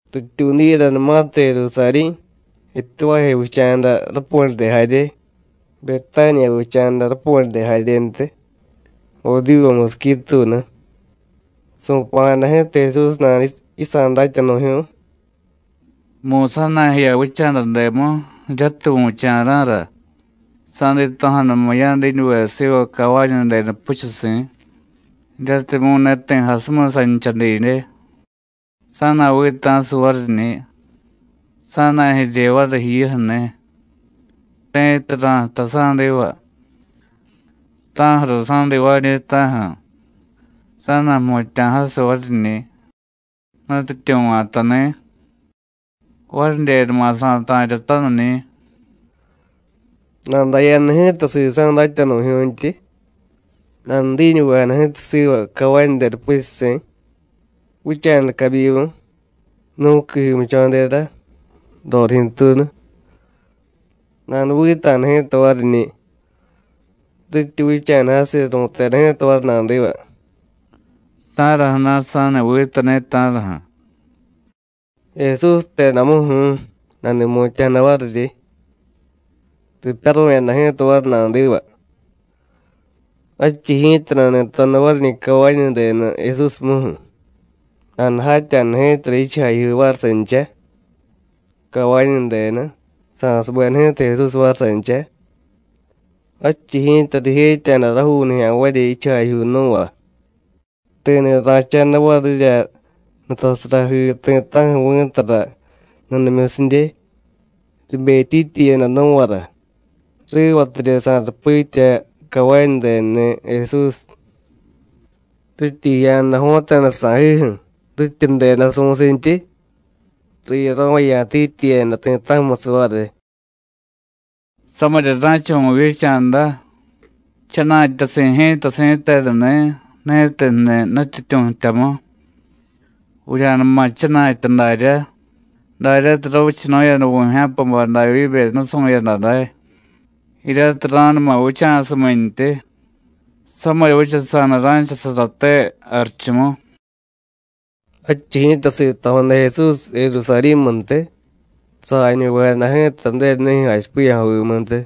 Rityuudiyadanumatirya Jerusarí̱, Betuváje vicha̱da rapu̱ryade jarye, Betániya vicha̱da rapu̱ryade jaryentiy, Odivu musiqui tuunu, su̱pa̱jada ji̱ta Jesús nada yisa̱ datyanu̱jyu̱y: “Mu̱y sa̱na̱jiya vicha̱dademu jiryatiy vu̱cha̱ra̱ra, sa̱dito̱jadamu ya̱diñuve siva cavañudenu puchusi̱, jiryatimyu̱ ne ti̱ jasumiy sancha didye; sa̱na̱vita̱siy variñi̱, sa̱na̱jirye variy jiyuju̱ni̱. Ti̱tiy ra̱jtay sa̱diva: ¿Ta̱ju̱ra sa̱divaañi̱, ta̱ju̱? Sa̱na̱jmutya̱jasiy variñi̱: Nutyityu̱ va̱tani̱. Varidyenuma sa̱ta̱ryataniñi̱.” Nadaya̱da ji̱ta sisa̱ datyanu̱jyu̱ntyi, nanudiñuvejada ji̱ta siva cavañudenu puchusi̱, vicha̱da cabyimu, nú̱qui jimudcho̱dera, rorijyu̱tuunu. Nanuvita̱da ji̱ta variñi̱. Rityi vicha̱da jasiy, ru̱teda ji̱ta variy nadiva: “¿Ta̱raju̱na̱ sa̱ni vitani̱, ta̱raju̱?” “Jesús jtedamuju̱u̱” nani̱mutya̱jada variryi. Ripyaru̱yada ji̱ta variy nadiva. Jadchiy ji̱ta nani̱toda variñi̱ cavañudenu Jesúsmuju̱; nanujatya̱da ji̱tara jichujajyuu variy sancha, cavañudenu, sa̱subeda ji̱ta Jesús variy sancha. Jadchiy ji̱ta rijetya̱da rajuu nijya̱nvarya jichujajyuu nú̱va, ti̱ni̱ ra̱cha̱da varirya nutasarajii ti̱ta̱ju̱ vi̱tara nudimyusidye, ribetyityiyada nú̱vara, rivatidye sa̱rupitya cavañudenuni̱ Jesús. Rityi jiya̱da jo̱ta̱da sa̱jiju̱, rityi ju̱deda su̱sintyi, riyaro̱vaya̱tityiyada ti̱ta̱ju̱musiy variy: “¡Samirya ra̱cha vu̱vyicha̱da! ¡Jchana̱tyasi̱ ji̱ta si̱tenuni̱, ni̱tiy jniy Nutyityu̱ jtyamu! Vurya̱numa jchana̱tya daryá, daryatiy ravichanu̱yada vu̱jya̱pabay Davyíbe nusu̱yada day, jiryatiy ra̱numa vicha̱sumintyi. ¡Samirya vichasa̱da ra̱chasaraté jarichumu!” Jadchiy ji̱ta sito̱jada Jesús Jerusarí̱muntiy, sajañuvejada ji̱ta Ju̱denunijyu̱ jachipiya̱jovimuntiy.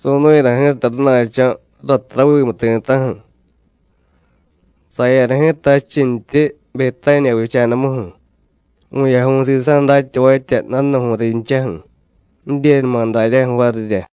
Su̱nu̱yada ji̱ta rana̱cho̱ ratiy ravimu ti̱ta̱ju̱. Saya̱da ji̱ta jadchintyi Betániya vicha̱damuju̱, vu̱yaju̱y sisa̱ datyavatya, danu̱ju̱y rinchaju̱, jidyenuma daryaju̱ varirya.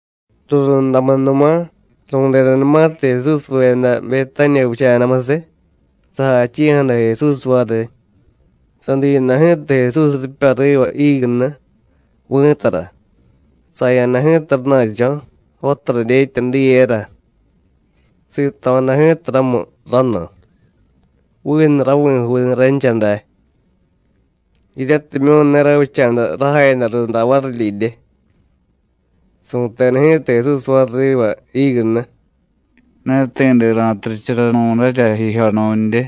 Rurundamunuma, ru̱dedanumatiy Jesúsveda Betániya vicha̱damusiy, sajachi̱jada Jesús variy. Sadiyada ji̱ta Jesús ripya riva jígunu, vi̱tara, saya̱da ji̱ta rana̱cho̱, jotara dyetya diyera. Sito̱jada ji̱ta ramu ranu, vinu ravi̱juuniy rancha day, jiryatimyu̱ ne ravicha̱da rajayada runda varidyidye. Su̱teda ji̱ta Jesús variy riva jígunu: “Ne ti̱de ra̱turicharanu̱darya jijyo nu̱ndye.”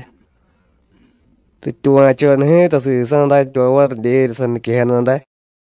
Rityuva̱choda ji̱ta sisa̱ datyavay varidyerya saniquejada day.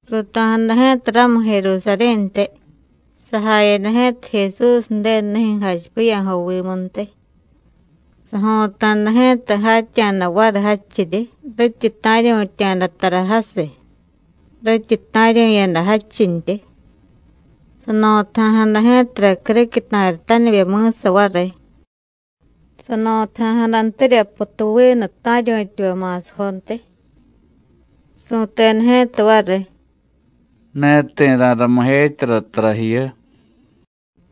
Ruuto̱jada ji̱ta ramu Jerusarí̱ntiy. Sajayada ji̱ta Jesús Ju̱denunijyu̱ jachipiya̱jovimuntiy, sajo̱ta̱da ji̱ta jatya̱da variy jadchiryi rityi ta̱ryu̱tya̱da tara jasiy, rityi ta̱ryu̱yada jadchintyi. Sano̱taja̱jada ji̱tara criquiy ta̱ritanivye mi̱sa variy, sano̱taja̱jadantirya putuvinu ta̱ryu̱tyavay ma̱sajontiy. Su̱teda ji̱ta variy: “Ne ti̱ ra̱ramijetyara tara jiyu.”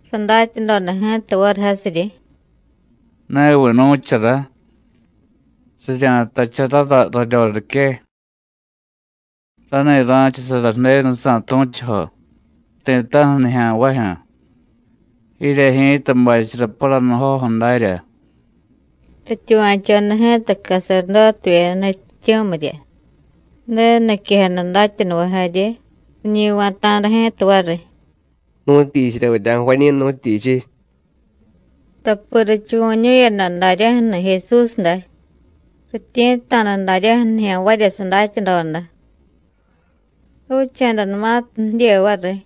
Sadatyadoda ji̱ta variy jasiryi: “Neviy nu̱chara: Rirya̱jtacharara raryorique: Rani̱ ra̱chasara Ju̱denujsa̱ tu̱chujo, ti̱ta̱ju̱ nijya̱nvajyu̱. Jirye ji̱ta bachara paranujoju̱ darya.” Rityuva̱choda ji̱ta caserdótevyeda nutyityu̱mirya, Ju̱denu niquejada datyanuvay jarye, riñi va̱ta̱da ji̱ta variy: “¿Nu̱tyichirya vurya̱jvañi̱, nu̱tyichiy?” Tapi richuvu̱ñu̱yada daryaju̱ni̱ Jesús day, rityi̱tta̱da daryaju̱ nijya̱nvarya sadatyadoda. Ravicha̱danumatiy jidye variy,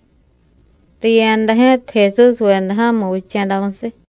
riya̱da ji̱ta Jesúsveda ja̱mu vicha̱damusiy.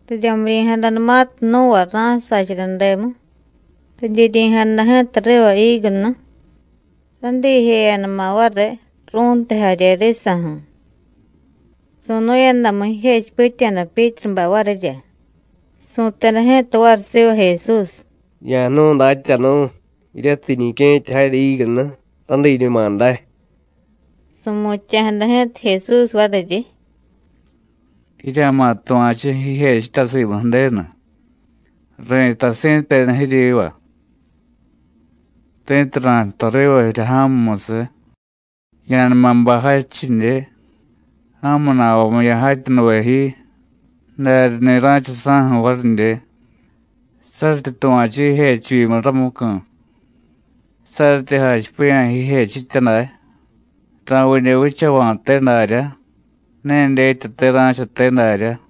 Riryamiryi̱jadanumatiy nú̱va ra̱sacharademu, ridyiryi̱jada ji̱ta riva jígunu, radiijeyadama̱ variy, ru̱ntiy jarye risa̱ju̱. Su̱nu̱yadamu, jijechipitya̱da Pyítrubay varirya, su̱teda ji̱ta variy siva Jesús: “Ya̱jnu̱y, Datyanu̱, jiryatiy jiñique̱tyajarya jígunu, radiiñuma day.” Su̱mutya̱jada ji̱ta Jesús variryi: “Jirya̱ma̱ tuva̱chu jijechitya simu Ju̱denu. Ri̱tay si̱tenu jiryiva: Ti̱tiy ra̱jtay riva jirya ja̱mumusiy: Ya̱numa bay jadchidye, ja̱mu na̱vamu ya̱jatyanuve ji, daryani̱ ra̱cha saju̱ varidye, saryityi tuva̱chu jijechivyimu ramucu̱. Saryityi jachipiya̱ jijechitya day: Ra̱vidye vichava̱te daryá, ne dyetyate ra̱chate darya.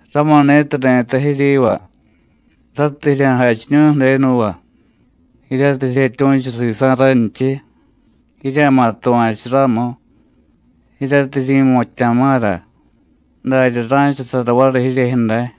Ramuni̱tiy ri̱tay jiryiva: Ratiy jirya̱jachiñu̱y Ju̱denuva, jiryatiy jiryetyu̱chu sisa̱ ranchiy, jirya̱ma̱ tuva̱chu ramu, jiryatiy jiryi̱mutya̱ma̱ra, darya ra̱chasara variy jiryejyu̱ day.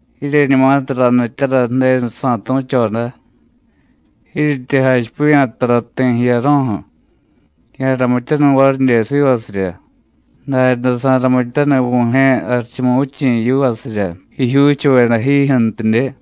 Jiryeñumatiy ranityara Ju̱denusa̱ tu̱choda, jiiryityi jachipiya̱ tara ti̱ jiyaro̱ju̱, ya̱ramityaniy varidye sivasirya, daryaday sa̱ramityaniy Vu̱jye̱ Jarichumuvichi̱ yivasirya jijyuuchuveda jijyu̱ntidye.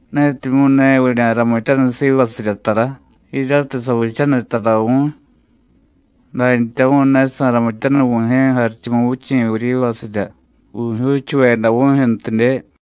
Netimyu̱ ne vurya̱ramityaniy sivasirya tara jiryatiy savichaniy tara vu̱y, dantyamu̱y ne sa̱ramityaniy Vu̱jye̱ Jarichumuvichi̱ vuryivasirya vu̱jyuuchuveda vu̱jyu̱ntidye.”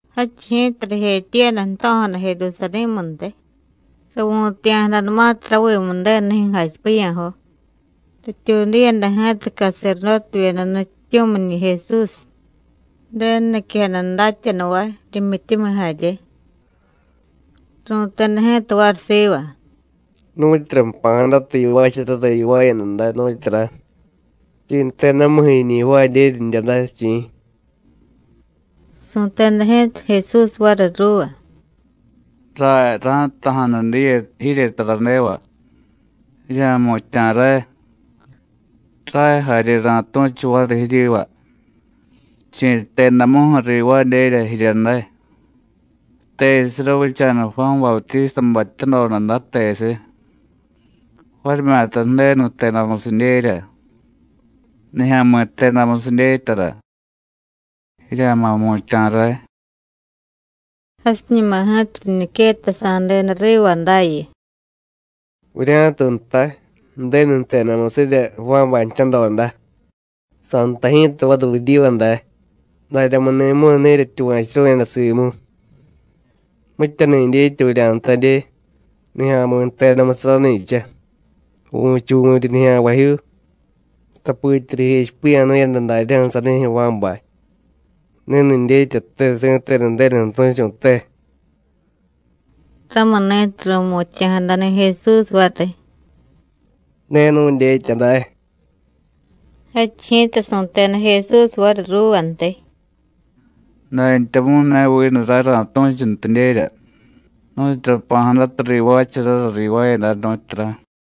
Jadchiy ji̱ta rijetyiiyada jto̱jada Jerusarí̱muntiy. Savu̱taya̱jadanumatiy ravimu Ju̱denunijyu̱ jachipiya̱jo, rityuudiyada ji̱ta caserdótevyeda nutyityu̱miñi̱ Jesús, Ju̱denu niquejada datyanuvay, rimyityumiy jarye. Ru̱teda ji̱ta variy siva: “¿Nu̱tyura jpa̱jadata yivaacharara yivaayada day, nu̱tyura? ¿Chi̱ jtedamuju̱ jiñi jvaadyerya jirya day, chi̱?” Su̱teda ji̱ta Jesús variy ruuva: “Ray ra̱jtaja̱nu diye jirye taradeva. Jirya̱jmutya̱ ray, ray jarye ra̱tu̱chu variy jiryiva chi̱ jtedamuju̱ rivaadyerya jirya day. ¿Tesiy ravicha̱da Juán Bautístabay jtyadoda day, tesiy? varimyata Ju̱denu jtedamusidyerya, nijya̱mi̱ jtedamusiy dyetyara. Jirya̱ma̱ jmutya̱ ray.” Jasiñuma ji̱ta riñiquettasa̱deda riva dayu: “Vurya̱tiy jtay: Ju̱denu jtedamusirya Juánbay jtyadoda, sa̱jtay ji̱ta variy vuryiva day: ¿Daryamuni̱mu̱y ne jiryetyuva̱churu̱yada simu? ¿Mityani̱ dyetya vurya̱jtadye: Nijya̱mi̱ jtedamusiy rani̱cha? Vu̱chuvu̱ryi nijya̱nvajyuu. Tapitya rijechipiya̱nu̱yada daryaju̱ sanijyu̱ Juánbay: Ni̱ni̱ dyetyate si̱tenu Ju̱denuju̱ tu̱chu̱te.” Ramuni̱tiy ru̱mutya̱jadani̱ Jesús variy: “Ne nu̱dyetya day.” Jadchiy ji̱ta su̱teda Jesús variy ruuvantiy: “Dantyamu̱y ne vinu ray ra̱tu̱chuntidyerya nu̱tyura jpa̱jadata rivaacharara rivaayada, nu̱tyura.”